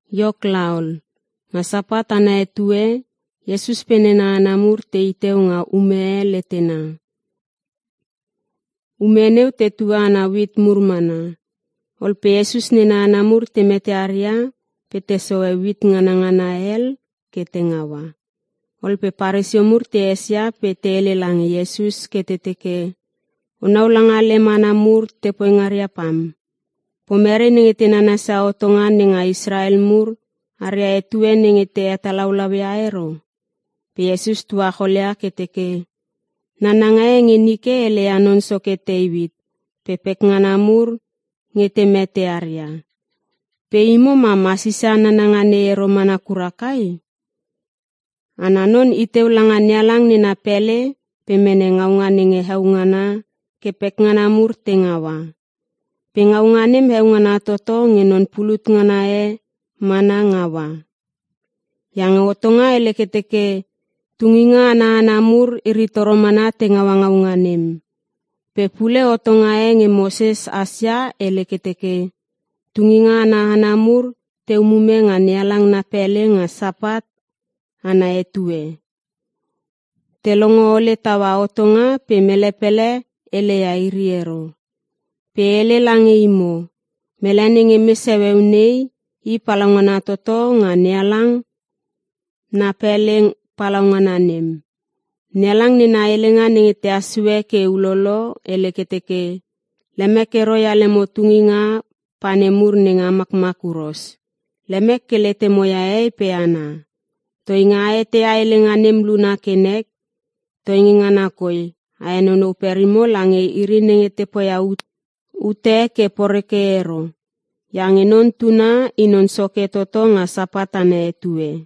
Iok laol, nga Sapat ana etue, Iesus pe nena hana mur te i teu nga ume e letena. Ume neu tetue ana uit mur mana. Ol pe Iesus nena hana mur te mete aria pe te sohe uit nganangana hel ke te ngaua. Ol pe Paresio mur te esia pe te hele lange Iesus ke te teke, “O nau langa lem hana mur te poi ngaria pam! Pomere nenge te nanasia hotonga nenga Israel mur aria etue nenge te hetalaulau ia ero?” Pe Iesus tuacholia ke teke, “Nananga e nge nike hele ia non soke Teuit pe pekngana mur nge te mete aria. Pe imo mam a sisia nananga nei ero mana kura kai? Ana non i teu langa NeHalang nena pele pe mene ngaunga nenge heo ngana ke pekngana mur te ngaua. Pe ngaunga nem heo ngana toto nge non pulut ngana e mana ngaua. Iange hotonga hele ke teke tunginga ana hana mur, iri toro mana te ngaua ngaunga nem. Pe pule hotonga e nge Moses hasia hele ke teke, tunginga ana hana mur te umume nga NeHalang na pele nga Sapat ana etue. Te longo ole taua hotonga pe mele pele hele ia iri ero. Pe e hele lange imo, mele nenge mes heueu nei, i palaungana toto nga NeHalang na pele palaungana nem. NeHalang nena helenga nenge tehas sue ke ulolo, hele ke teke, ‘Lemek ero ia lemo tunginga pa nemur nenge a makmak huros. Lemek ke letemo ia hehei pe hana.’ Toinge a eteia helenga nem luna ke nek, toi ngana koi a henonou perimo lange iri nenge te poia ute ke poreke ero. Iange Non Tuna, I non Soke toto nga Sapat ana etue.”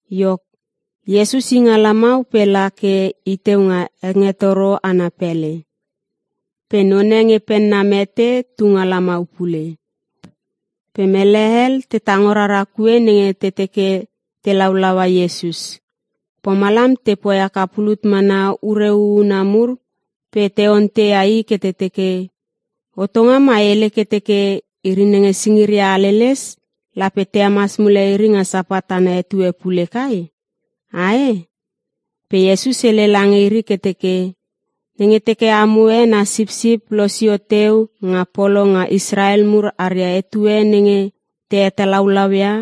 Iok, Iesus i nga lamau pe la ke i teu nga hengetoro ana pele. Pe none nge penna mete tu nga lamau pule. Pe mele hel te tango rara kue nenge te teke te laulaua Iesus. Pomalam te poi haka pulut mana ure huhuna mur pe te onteia I ke te teke, “Hotonga mai hele ke teke iri nenge singiria haleles, lape te hemas mule iri nga Sapat ana etue pule kai? Ae?” Pe Iesus hele lange iri ke teke, “Nenge teke amo e na sipsip losio teu nga polo nga Israel mur aria etue nenge te hetalaulau ia,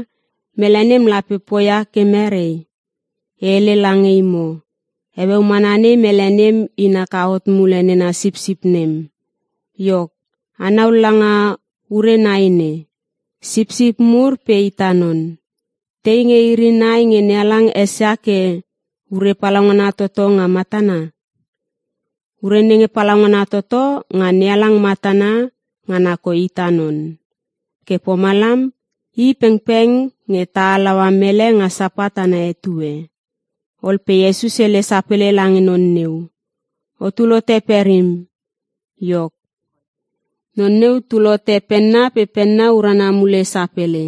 mele nem lape poia ke mere? E hele lange imo, heueu mana nei mele nem in haka hot mule nena sipsip nem. Iok, anau langa ure nai nei, sipsip mur pe ita non. Tei nge iri nai nge NeHalang esia ke ure palaungana toto nga matana? Ure nenge palaugnana toto nga NeHalang matana, ngana koi ita non. Ke pomalam, i pengpeng nge ta halaua mele nga Sapat ana etue.” Ol pe Iesus hele sapele lange non neu, “O tul hote perim.” Iok, non neu tul hote penna pe penna urana mule sapele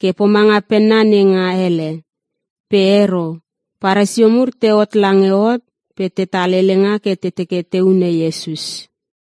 ke pomanga penna nenga hele. Pe ero, Paresio mur tehot lange hot pe tetal helenga ke te teke te hune Iesus.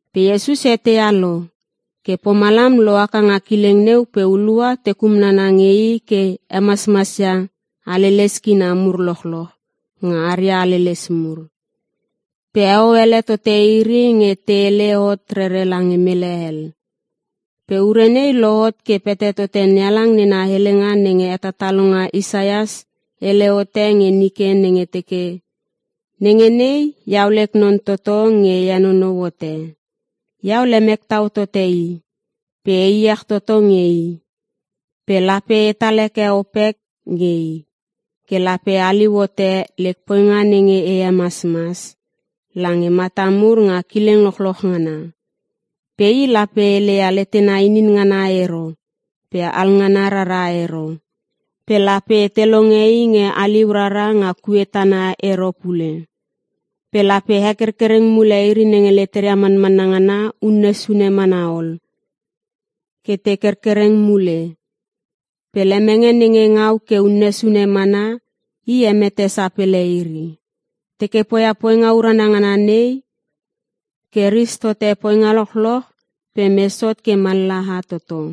Pe Iesus eteia lo. Ke pomalam lohaka nga kileng neu pe hulua te kumnana nge i ke hemasmasia haleles kina mur lochloch nga aria haleles mur. Pe heo ele tote iri nge te hele hot rere lange mele hel. Pe ure nei lohot ke pete tote NeHalang nena helenga nenge hetatalonga Isaias hele hote nge nike nenge teke, “Nenge nei, Iau lek non toto nge E henonou hote. Iau lemek tau tote I pe E iech toto nge I. Pe lape etal heke opek nge I, ke lape haliu hote lek poinga nenge e hemasmas lange mata mur nga kileng lochloch ngana. Pe I lape hele ia letena inin ngana ero pe alngana rara ero. Pe lape te longe I nge haliu rara nga kue tana ero pule. Pe lape hekerkereng mule iri nenge leteria manmanna ngana unne sune mana ol, ke te kerkereng mule. Pe lemenge nenge ngau ke unne sune mana, i hemete sapele ero. Teke poia poinga urana ngana nei, ke ris tote poinga lochloch pe mes hot ke mallaha toto.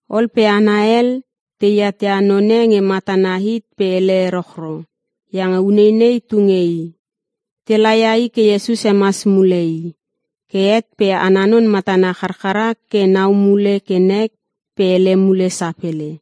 Ol pe hana hel, teat ia none nge matana hit pe hele erochro iange uneinei tu nge i. Te laia i ke Iesus hemas mule i. Ke het pe ana non matana charchara ke nau mule ke nek pe hele mule sapele.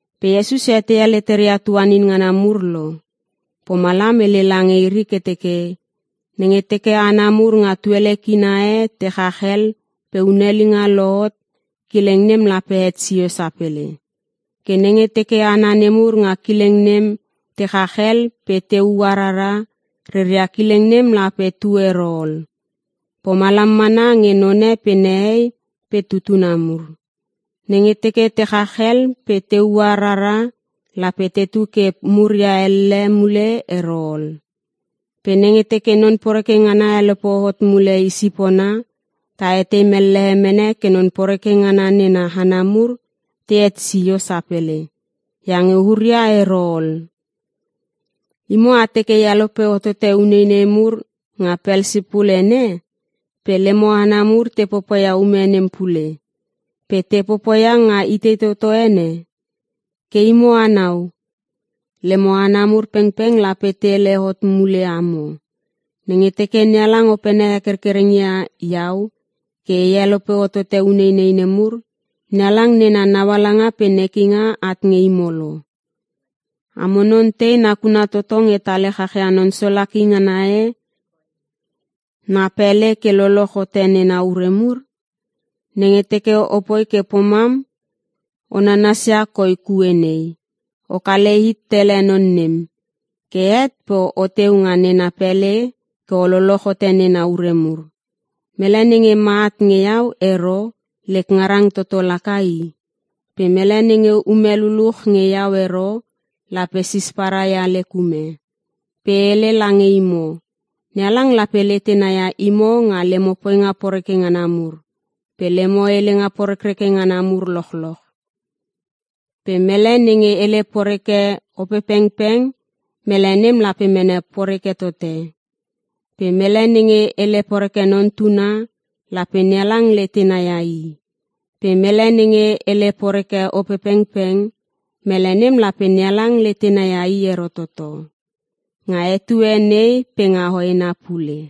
Pe Iesus eteia leteria tuanin ngana mur lo, pomalam hele lange iri ke teke, “Nenge teke hana mur nga tuele kina e te chach hel pe hunelinga lohot, kileng nem lape het sio sapele. Ke nenge teke hana nemur nga kileng nem te chach hel pe te ua rara, reria kileng nem lape tu ero ol. Pomalam mana nge none pe nehei pe tutuna mur. Nenge teke te chach hel pe te ua rara lape tetu ke muria elle mule ero ol. Pe nenge teke non poreke ngana helope hot mule i sipona, ta etei mellehe mene ke non poreke ngana nena hana mur, te het sio sapele iange huria ero ol. “Imo a teke e helope hotote uneinei mur nga Pelsipul ene, pe lemo hana mur te popoia ume nem pule. Pe te popoia nga itei toto ene? Ke imo anau, lemo hana mur pengpeng lape te hele hot mule amo. Nenge teke NeHalang opene hekerkereng ia iau, ke e helope hotote uneinei nemur, NeHalang nena naualanga pe nekinga at nge imo lo. “Amo non tei nakuna toto nge tale chachia non solaki ngana e na pele ke loloch hote nena ure mur? Nenge teke o poi ke pomam o nanasia koi kue nei. O kale hit tele non nem. Ke het pe o teu nga nena pele ke o loloch hote nena ure mur. “Mele nenge ma at nge iau ero, lek ngarang toto laka i. Pe mele nenge ume luluch nge iau ero, lape sisparai ia lek ume. Pe e hele lange imo, NeHalang lape letena ia imo nga lemo poinga poreke ngana mur, pe lemo helenga porekreke ngana mur lochloch. Pe mele nenge hele poreke Opepengpeng, mele nem lape mene poreke tote. Pe mele nenge hele poreke Non Tuna, lape NeHalang letena ia i. Pe mele nenge hele poreke Opepengpeng, mele nem lape NeHalang letena ia i ero toto, nga etue nei pe nga hoena pule.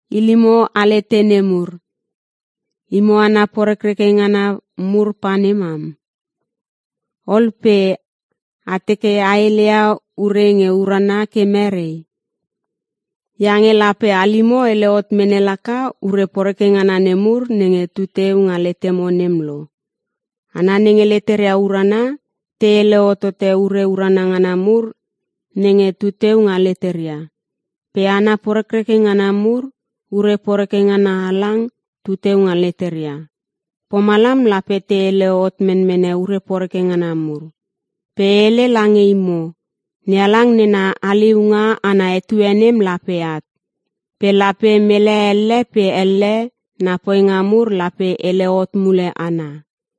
Ilimo alete nemur! Imo hana porekreke ngana mur pa ne mam. Ol pe a teke a heleia ure nge urana ke mere? Iange lape halimo hele hot mene laka ure poreke ngana nemur nenge tu teu nga letemo nem lo. Hana nenge leteria urana, te hele hotote ure urana ngana mur nenge tu teu nga leteria. Pe hana porekreke ngana mur, ure poreke ngana halang tu teu nga leteria, pomalam lape te hele hot menmene ure poreke ngana mur. Pe e hele lange imo, NeHalang nena haliunga ana etue nem lape at, pe lape mele elle pe elle na poinga mur lape hele hot mule ana.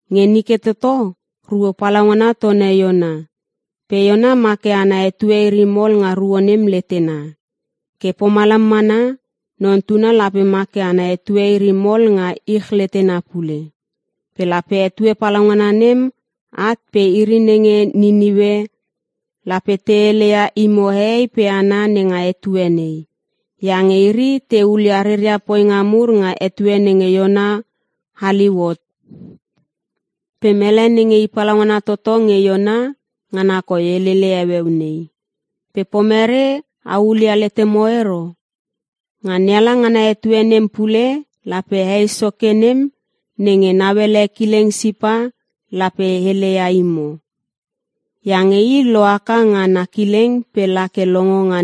Nge nike toto, ruo palaungana tone Iona. Pe Iona ma ke ana etue iri mol nga ruo nem letena. Ke pomalam mana, Non Tuna lape ma ke ana etue iri mol nga ich letena pule. Pe lape etue palaungana nem at pe iri nenge Niniue lape te hele ia imo hehei pe hana nenga etue nei. Iange iri te hulia reria poinga mur nga etue nenge Iona haliu hot. Pe mele nenge i palaungana toto nge Iona, ngana koi helele heueu nei, pe pomere a hulia letemo ero? Nga NeHalang ana etue nem pule, lape Hei Soke nem nenge nauele kileng Sipa lape heleia imo. Iange i lo haka nga na kileng pe la ke longo nga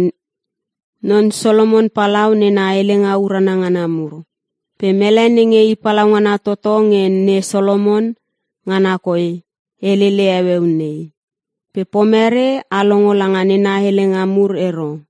Non Solomon Palau nena helenga urana ngana mur. Pe mele nenge I palaungana toto nge ne Solomon, ngana koi helele heueu nei. Pe pomere a longo langa nena helenga mur ero?”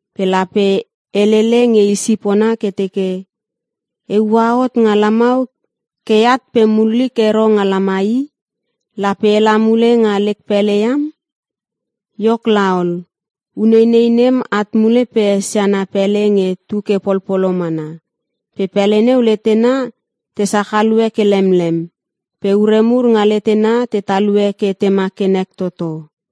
Pe lape helele nge i sipona ke teke, ‘E ua hot nga lamau ke e at pe mullik ero nga lamai i. Lape e la mule nga lek pele iam.’ Iok laol, uneinei nem at mule pe esia na pele nge tu ke polpolo mana. Pe pele neu letena te sachalue ke lemlem, pe ure mur nga letena te talue ke tema ke nek toto.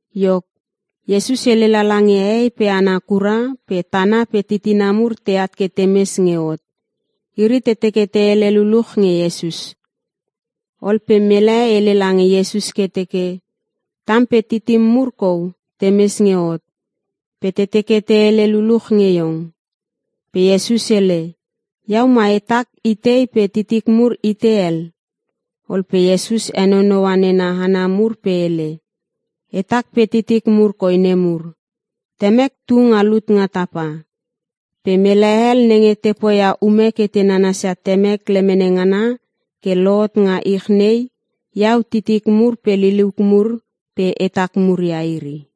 Iok, Iesus hele lala nge hehei pe hana kura, pe tana pe titina mur teat ke te mes nge hot. Iri te teke te hele luluch nge Iesus. Ol pe mele hele lange Iesus ke teke, “Tam pe titim mur kou te mes nge hot, pe te teke te hele luluch nge iong.” Pe Iesus hele, “Iau mai hetak itei pe titik mur itei hel?” Ol pe Iesus henonoua nena hana mur pe hele, “Hetak pe titik mur koi nemur. Temek tu nga lut nga tapa, pe mele hel nenge te poia ume ke nanasia Temek lemene ngana, ke lohot nga ich nei, iau titik mur pe liliuk mur pe hatak mur ia iri.”